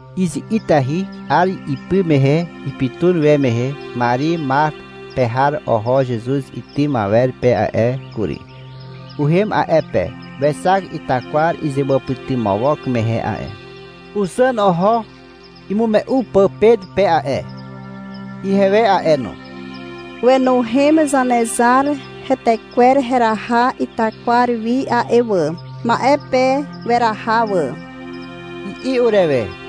Izi'itahy 'ar ipy mehe ipytun we mehe Mari Matar pe har oho Zezuz itym awer pe a'e kury. Uhem a'e pe. Wexak itakwar izewàpytymawok mehe a'e. Uzàn oho imume'u pà Pet pe a'e, ihewe a'e no. — Wenuhem Zanezar hetekwer heraha itakwar wi a'e wà. Ma'e pe weraha wà, i'i urewe.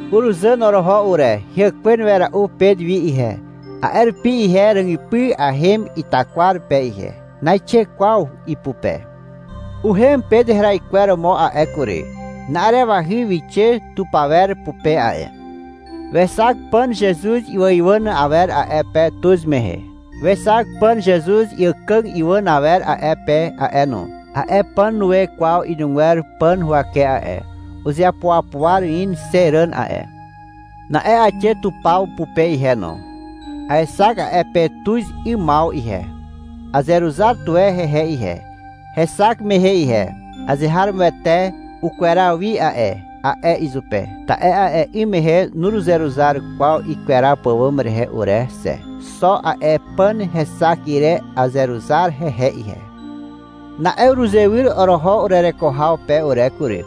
Uruzàn oroho ure. Heàkwen wera'u Pet wi ihe, a'e rupi ihe ràgypy ahem itakwar pe ihe. Naixe kwaw ipupe. Uhem Pet heraikweromo a'e kury. Na'arewahy wixe tupawer pupe a'e. Wexak pàn Zezuz iwàiwàn awer a'e pe tuz mehe. Wexak pàn Zezuz àkàg iwàn awer a'e pe a'e no. A'e pàn nue kwaw inugwer pàn huwake a'e. Uzeapuapuar in xe ràn a'e. Na'e aixe tupaw pupe ihe no. Aexak a'e pe tuz 'ymaw ihe. Azeruzar tuwe hehe ihe, hexak mehe ihe. — Azeharomoete ukweraw wi a'e, a'e izupe. Ta'e a'e 'ym mehe nuruzeruzar kwaw ikweraw pàwàm rehe ure xe. Xo a'e pàn hexak ire azeruzar hehe ihe. Na'e uruzewyr oroho urereko haw pe ure kury.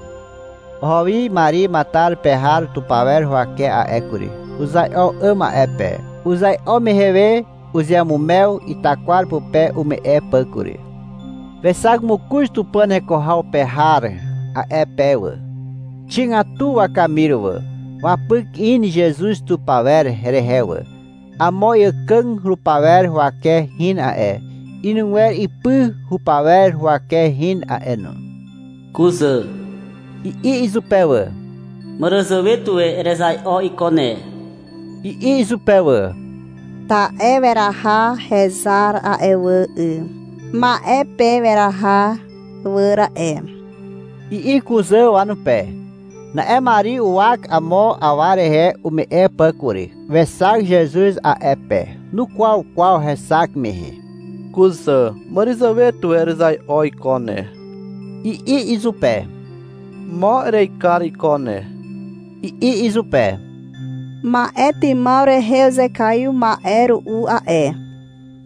Oho wi Mari Matar pe har tupaw huwake a'e kury. Uzai'o 'àm a'e pe. Uzai'o mehe we uzeamumew itakwar pupe ume'e pà kury. Wexak mokoz Tupàn heko haw pe har a'e pe wà. Xigatu wakamir wà. Wapyk in Zezuz tupawer rehe wà. Amo iàkàg rupawer huwake hin a'e. Inugwer ipy rupawer huwake hin a'e no. — Kuzà, i'i izupe wà. — Màràzàwe tuwe erezai'o iko ne, i'i izupe wà. — Ta'e weraha hezar a'e wà 'y. Ma'e pe weraha wà ra'e, i'i kuzà wanupe. Na'e Mari uwak amo awa rehe ume'e pà kury. Wexak Zezuz a'e pe. Nukwaw kwaw hexak mehe. — Kuzà, màràzàwe tuwe erezai'o iko ne, i'i izupe. — Mo erekar iko ne, i'i izupe. — Ma'etymaw rehe uzekaiw ma'e ru'u a'e,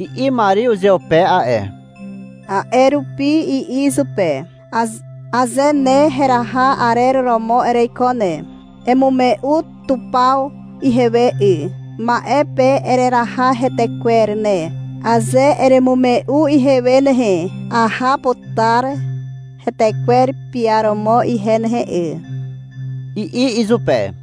i'i Mari uzeupe a'e. A'e rupi i'i izupe. — Aze ne heraha arer romo ereiko ne, emume'u tupaw ihewe 'y. Ma'e pe ereraha hetekwer ne. Aze eremume'u ihewe nehe, aha putar hetekwer piaromo ihe nehe 'y, i'i izupe.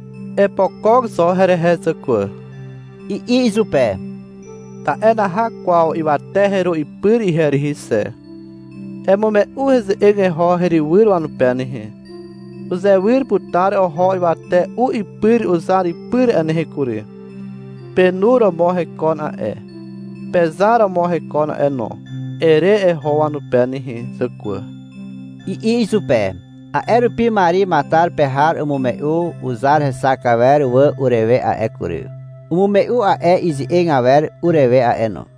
— Epokok zo herehe zàkwà, i'i izupe. — Ta'e naha kwaw ywate heru ipyr ihe rihi xe. Emume'u heze'eg eho herywyr wanupe nehe. — Uzewyr putar oho ywate u ipyr uzar ipyr a'e nehe kury. Penu romo hekon a'e. Pezar romo hekon a'e no, ere eho wanupe nehe zàkwà, i'i izupe. A'e rupi Mari Matar pe har umume'u uzar hexak awer wà urewe a'e kury. Umume'u a'e ize'eg awer urewe a'e no.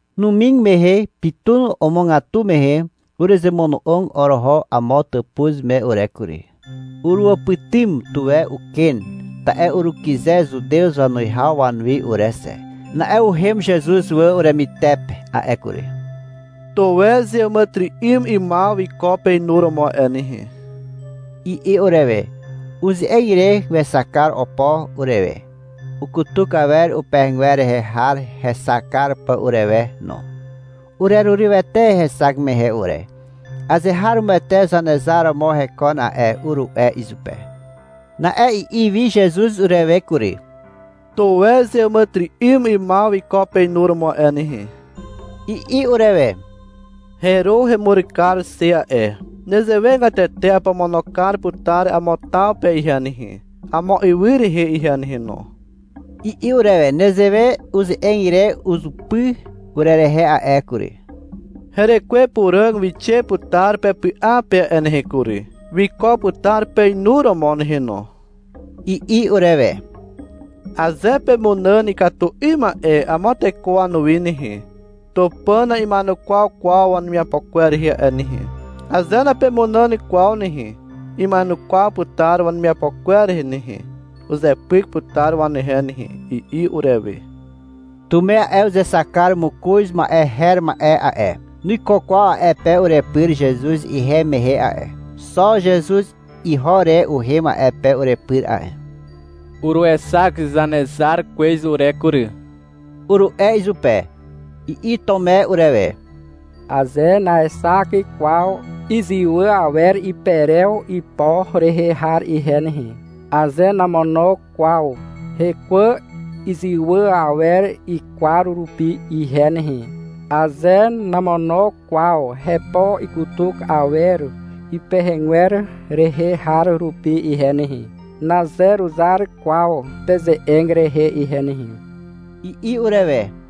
Numig mehe ipytun omogatu mehe uruzemono'og oroho amo tàpuz me ure kury. Uruwàpytym tuwe uken, ta'e urukyze Zutew wanuwihaw wanuwi ure xe. Na'e uhem Zezuz wà uremytepe a'e kury. — Tuwe zeàmàtyry'ym 'ymaw wiko peinuromo a'e nehe, i'i urewe. Uze'eg ire wexak kar opo urewe, ukutuk awer upehegwer rehe har hexak kar pà urewe no. Urerurywete hexak mehe ure. — Azeharomoete Zanezar romo hekon a'e, uru'e izupe Na'e i'i wi Zezuz urewe kury. — Tuwe zeàmàtyry'ym 'ymaw wiko peinuromo a'e nehe, i'i urewe. — Heru hemur kar xe a'e. Nezewegatete apomono kar putar amo taw pe ihe nehe, amo ywy rehe ihe nehe no, i'i urewe. Nezewe uze'eg ire uzupy urerehe a'e kury. — Herekwe Puràg wixe putar pepy'a pe a'e nehe kury. Wiko putar peinuromo nehe no, i'i urewe. — Aze pemunàn ikatu 'ym ma'e amo teko wanuwi nehe, Tupàn na'ima'enukwaw kwaw wanemiapo kwer rehe a'e nehe. Aze napemunàn kwaw nehe, ima'enukwaw putar wanemiapo kwer rehe nehe. Uzepyk putar wanehe nehe, i'i urewe. Tume a'e, (uzexak kar mokoz ma'e her ma'e a'e), nuiko kwaw a'e pe urepyr Zezuz ihem mehe a'e. Xo Zezuz iho re uhem a'e pe urepyr a'e. — Uruexak Zanezar kwez ure kury, uru'e izupe. I'i Tume urewe. — Aze naexak kwaw izywà awer iperew ipo rehe har ihe nehe, aze namono kwaw hekwà izywà awer ikwar rupi ihe nehe, aze namono kwaw hepo ikutuk awer ipehegwer rehe har rupi ihe nehe, nazeruzar kwaw peze'eg rehe ihe nehe, i'i urewe.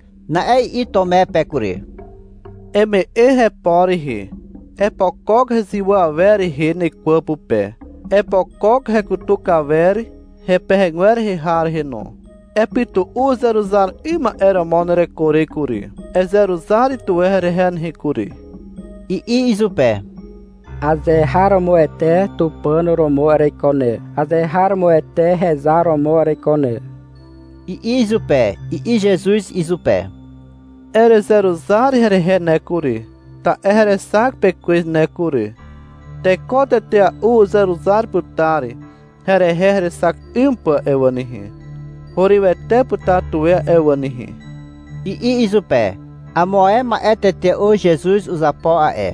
Na'e i'i Tume pe kury. — Eme'e hepo rehe. Epokok hezywà awer rehe nekwà pupe. Epokok hekutuk awer hepehegwer rehe har rehe no. Epytu'u uzeruzar 'ym ma'e romo nereko re kury. Ezeruzar tuwe herehe nehe kury, i'i izupe. — Azeharomoete Tupàn romo ereiko ne. Azeharomoete hezar romo ereiko ne, i'i izupe. I'i Zezuz izupe. — Erezeruzar herehe ne kury, ta'e herexak pe kwez ne kury. Teko tetea'u uzeruzar putar herehe herexak 'ym pà a'e wà nehe. Hurywete putar tuwe a'e wà nehe, i'i izupe. Amo ae ma'e tetea'u Zezuz uzapo a'e,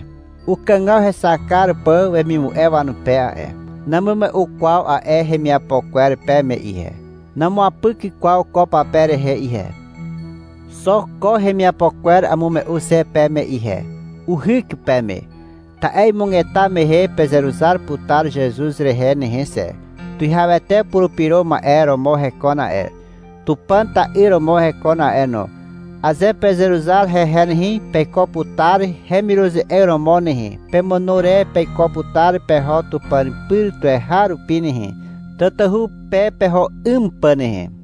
ukàgaw hexak kar pà wemimu'e wanupe a'e. Namume'u kwaw a'e hemiapo kwer peme ihe. Namuapyk kwaw ko pape rehe ihe. Xo ko hemiapo kwer amume'u xe peme ihe. Uhyk peme. Ta'e imugeta mehe pezeruzar putar Zezuz rehe nehe xe. Tuwihawete Purupyro Ma'e romo hekon a'e. Tupàn ta'yr romo hekon a'e no. Aze pezeruzar hehe nehe, peiko putar hemiruze'eg romo nehe. Pemàno re peiko putar peho Tupàn pyr tuweharupi nehe, tatahu pe peho 'ym pà nehe.